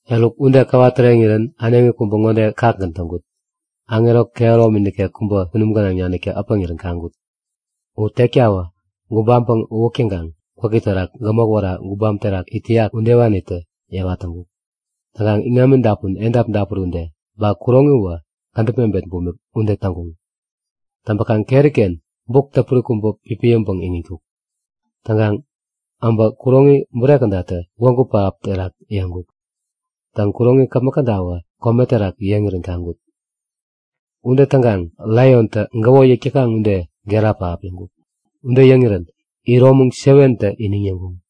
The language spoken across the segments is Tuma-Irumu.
Eruk ude käwa täreŋirän äneŋi kubä ŋode kakgän täŋkut; Aŋero kehäromi nikek kubä kunum gänaŋ naniktä äpäŋirän kaŋkut. U tektawä gubampäŋ uwäk täŋkaŋ gwäki terak gämok wära gubam terak it täyak udewanitä yewa täŋkuk. Täŋkaŋ iŋami dapun edap dapuri ude, ba kuroŋi uwä kädäp mebet bumik ude täŋkuŋ. Täŋpäkaŋ keri-ken buk täpuri kubä pipiyäŋpäŋ iŋitkuk. Täŋkaŋ abä kuroŋi bure kädatä gwägu pähap terak yeŋkuk. Täŋ, kuroŋi käpmäk kädawä kome terak yeŋirän kaŋkut. Ude täŋkaŋ laiontä gäwo yäk täkaŋ ude gera pähap yäŋkuk. Ude yäŋirän iromäŋ 7tä iniŋ yäŋkuŋ.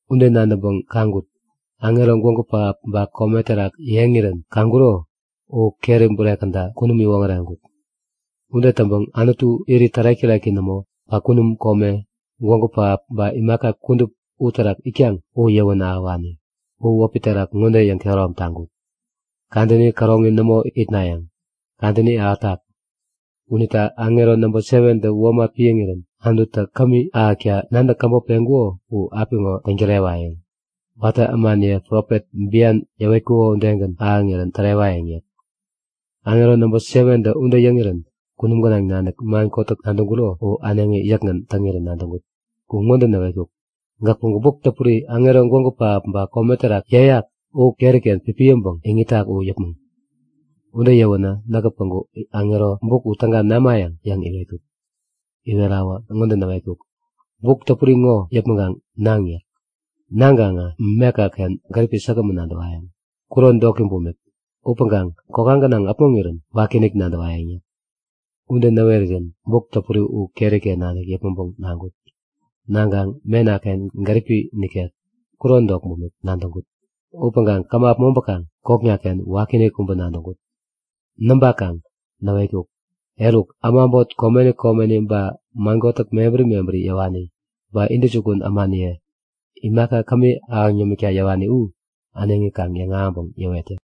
Ude nadäŋpäŋ kaŋkut; Aŋero gwägu pähap ba kome terak yeŋirän kaŋkuro u keri bure käda kunum iwoŋäreŋkuk. Ude täŋpäŋ Anutu, irit tärek-täreki nämo, ba kunum kome, gwägu pähap ba imaka kudup uterak itkaŋ u yäwän ahäwani, u wäpi terak ŋode yäŋkehärom taŋkuk; Kadäni käroŋi nämo itnayäŋ. Kadäni ahätak! Unita aŋero namba 7tä womat piäŋirän Anututä kämi täkta nadäk käbop peŋkuko u apiŋo täŋ-tärewayäŋ. Watä ämaniye profet bian yäwetkuko udegän ahäŋirän tärewayäŋ yäk. Aŋero nabä 7tä ude yäŋirän kunum gänaŋ nanik man kotäk nadäŋkuro u äneŋi yäkgän täŋirän nadäŋkut. U ŋode näwetkuk; Gäk päŋku buk täpuri aŋero gwägu pähap ba kome terak yeyak u keri-ken pipiyäŋpäŋ iŋitak u yäpmäŋ! Ude yäwänä näkä päŋku aŋero, buk u täga namayäŋ? yäŋ iwetkut. Iwerawä ŋode näwetkuk; Buk täpuri ŋo yäpmäŋkaŋ naŋ yäk. Naŋkaŋ mekaken gäripi säkgämän nadäwayäŋ, kuron doki bumik. Upäŋkaŋ kokka gänaŋ äpmoŋirän wakiinik nadäwayäŋ yäk. Ude näwerirän buk täpuri u keri-ken nanik yäpmäŋpäŋ naŋkut. Naŋkaŋ mena-ken gäripi nikek, kuron dok bumik nadäŋkut. Upäŋkaŋ käma äpmoŋpäkaŋ kokna-ken wakiinik kubä nadäŋkut. Näŋpakaŋ näwetkuk; Eruk, äma äbot komeni komeni ba man kotäk mebäri mebäri yäwani ba intäjukun ämaniye, imaka kämi ahäŋ yämikta yäwani u äneŋi kaŋ yäŋahäŋpäŋ yäwet yäk.